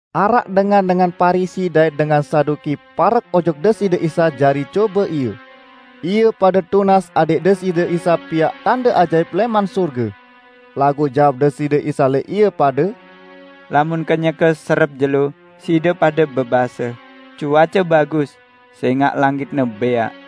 Araq dengan-dengan Parisi dait dengan Saduki parek ojok Deside Isa jari cobe Ie. Ie pade tunas adẽq Deside Isa piaq tande ajaip lẽman sorge. Laguq jawab Deside Isa lẽq ie pade, ["Lamun kenyeke serep jelo, side pade bebase, 'Cuace bagus, sẽngaq langitne bẽaq.'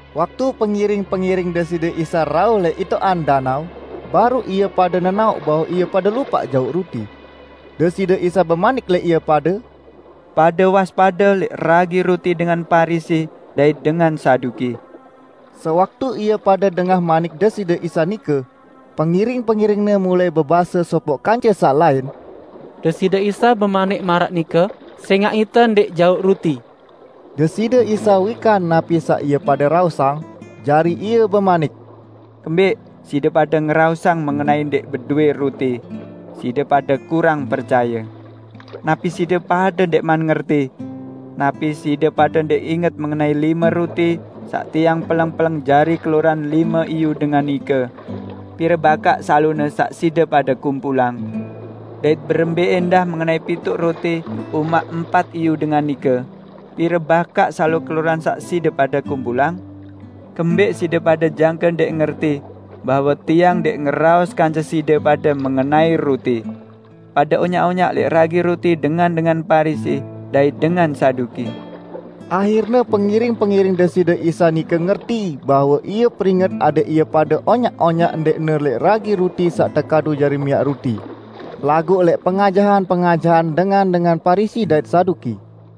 Waktu pengiring-pengiring Deside Isa rauh lẽq itoqan danao, baruq ie pade nenaoq bahwe ie pade lupaq jauq ruti. Deside Isa bemanik lẽq ie pade, "Pade waspade lẽq ragi ruti dengan Parisi dait dengan Saduki." Sewaktu ie pade dengah manik Deside Isa nike, pengiring-pengiring-Ne mulai bebase sopoq kance saq lain, "Deside Isa bemanik maraq nike sẽngaq ite ndẽq jauq ruti." Deside Isa wikan napi saq ie pade raosang, jari Ie bemanik, "Kembẽq side pade ngeraosang mengenai ndẽq bedowẽ ruti? Side pade kurang percaye! Napi side pade ndẽqman ngerti? Napi side pade ndẽq inget mengenai lime ruti saq Tiang peleng-peleng jari keloran lime iyu dengan nike? Pire bakaq salone saq side pade kumpulang? Dait berembẽ ẽndah mengenai pituq ruti umaq empat iyu dengan nike, pire bakaq salo keloran saq side pade kumpulang? Kembẽq side pade jangke ndẽq ngerti bahwe Tiang ndẽq ngeraos kance side pade mengenai ruti? Pade onyaq-onyaq lẽq ragi ruti dengan-dengan Parisi dait dengan Saduki!" Ahirne pengiring-pengiring Deside Isa nike ngerti bahwe Ie peringet adẽq ie pade onyaq-onyaq ndẽqne lẽq ragi ruti saq tekadu jari miaq ruti, laguq lẽq pengajahan-pengajahan dengan-dengan Parisi dait Saduki.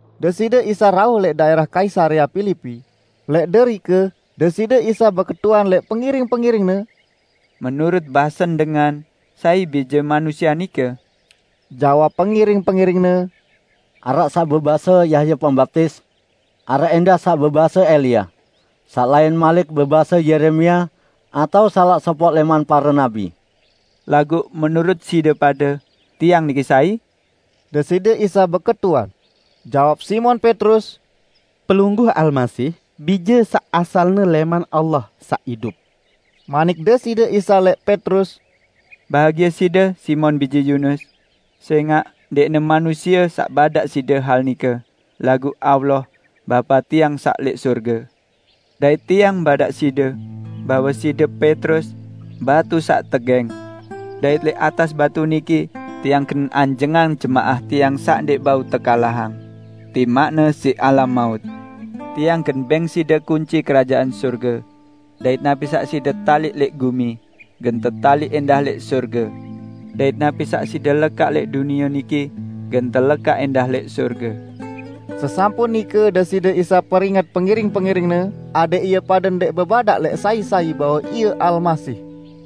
Deside Isa rauh lẽq daẽrah Kaisarea Pilipi. Lẽq derike Deside Isa beketuan lẽq pengiring-pengiring-Ne, "Menurut basen dengan, sai Bije Manusie nike?" Jawab pengiring-pengiring-Ne, "Araq saq bebase Yahya Pembaptis. Araq ẽndah saq bebase Elia, saq lain malik bebase Yeremia atao salaq sopoq lẽman pare nabi." "Laguq menurut side pade, Tiang niki sai?" Deside Isa beketuan. Jawab Simon Petrus, "Pelungguh Almasih, Bije saq asalne lẽman Allah saq idup." Manik Deside Isa lẽq Petrus, "Bahagie side, Simon bije Yunus! Sẽngaq ndẽqne manusie saq badaq side hal nike, laguq Allah, Bapa Tiang saq lẽq sorge. Dait Tiang badaq side, bahwe side Petrus, batu saq tegẽng. Dait lẽq atas batu niki Tiang gen anjengang jemaah Tiang, saq ndẽq bau tekalahang; timaqne siq alam maut! Tiang gen bẽng side kunci Kerajaan Sorge. Dait napi saq side taliq lẽq gumi, gen tetaliq ẽndah lẽq sorge. Dait napi saq side lekaq lẽq dunie niki, gen telekaq ẽndah lẽq sorge." Sesampun nike Deside Isa peringet pengiring-pengiring-Ne adẽq ie pade ndẽq bebadaq lẽq sai-sai bahwe Ie Almasih.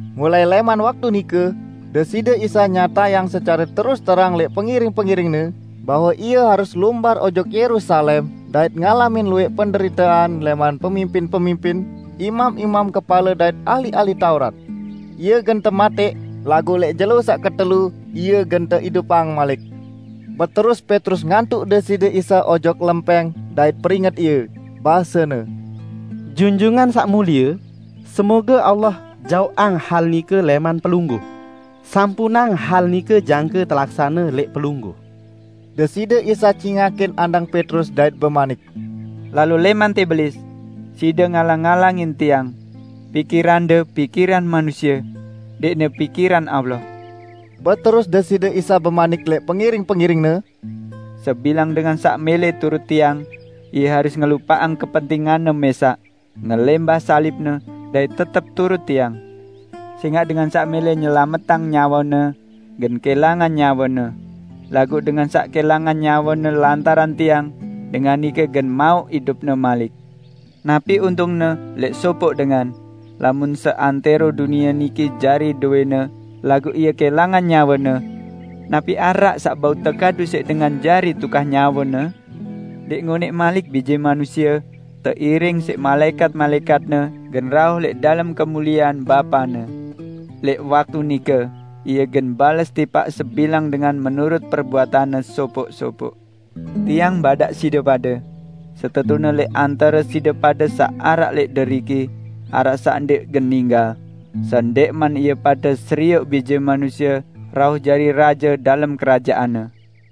Mulai lẽman waktu nike, Deside Isa nyatayang secare terus terang lẽq pengiring-pengiring-Ne, bahwe Ie harus lumbar ojok Yerusalem dait ngalamin luwẽq penderitean lẽman pemimpin-pemimpin, imam-imam kepale dait ahli-ahli Taurat. Ie gen tematẽq, laguq lẽq jelo saq ketelu Ie gen teidupang malik. Beterus Petrus ngantuq Deside Isa ojok lempẽng dait peringet Ie, basene, "Junjungan Saq Mulie, semoge Allah jaoqang hal nike lẽman Pelungguh! Sampunang hal nike jangke telaksane lẽq Pelungguh!" Deside Isa cingakin andang Petrus dait bemanik, "Lalo lẽman tẽ Belis! Side ngalang-ngalangin Tiang. Pikirande pikiran manusie; ndẽqne pikiran Allah!" Beterus Deside Isa bemanik lẽq pengiring-pengiring-Ne, "Sebilang dengan saq mẽlẽ turut Tiang, ie harus ngelupaqang kepentinganne mẽsaq, ngelẽmbah salibne, dait tetep turut Tiang. Sẽngaq dengan saq mẽlẽ nyelametang nyawene, gen kẽlangan nyawene. Laguq dengan saq kẽlangan nyawene lantaran Tiang, dengan nike gen mauq idupne malik. Napi untungne lẽq sopoq dengan, lamun seantẽro dunie niki jari dowẽne, laguq ie kẽlangan nyawene? Napi araq saq bau tekadu siq dengan jari tukah nyawene? Ndẽq ngonẽq malik Bije Manusie, teiring siq malaẽkat-malaẽkat-Ne gen rauh lẽq dalem kemuliean Bapa-Ne. Lẽq waktu nike, Ie gen bales tipaq sebilang dengan menurut perbuatanne sopoq-sopoq. Tiang badaq side pade: Setetune lẽq antare side pade saq araq lẽq deriki, araq saq ndẽq gen ninggal, sendẽqman ie pade serioq Bije Manusie rauh jari Raje dalem Kerajaan-Ne."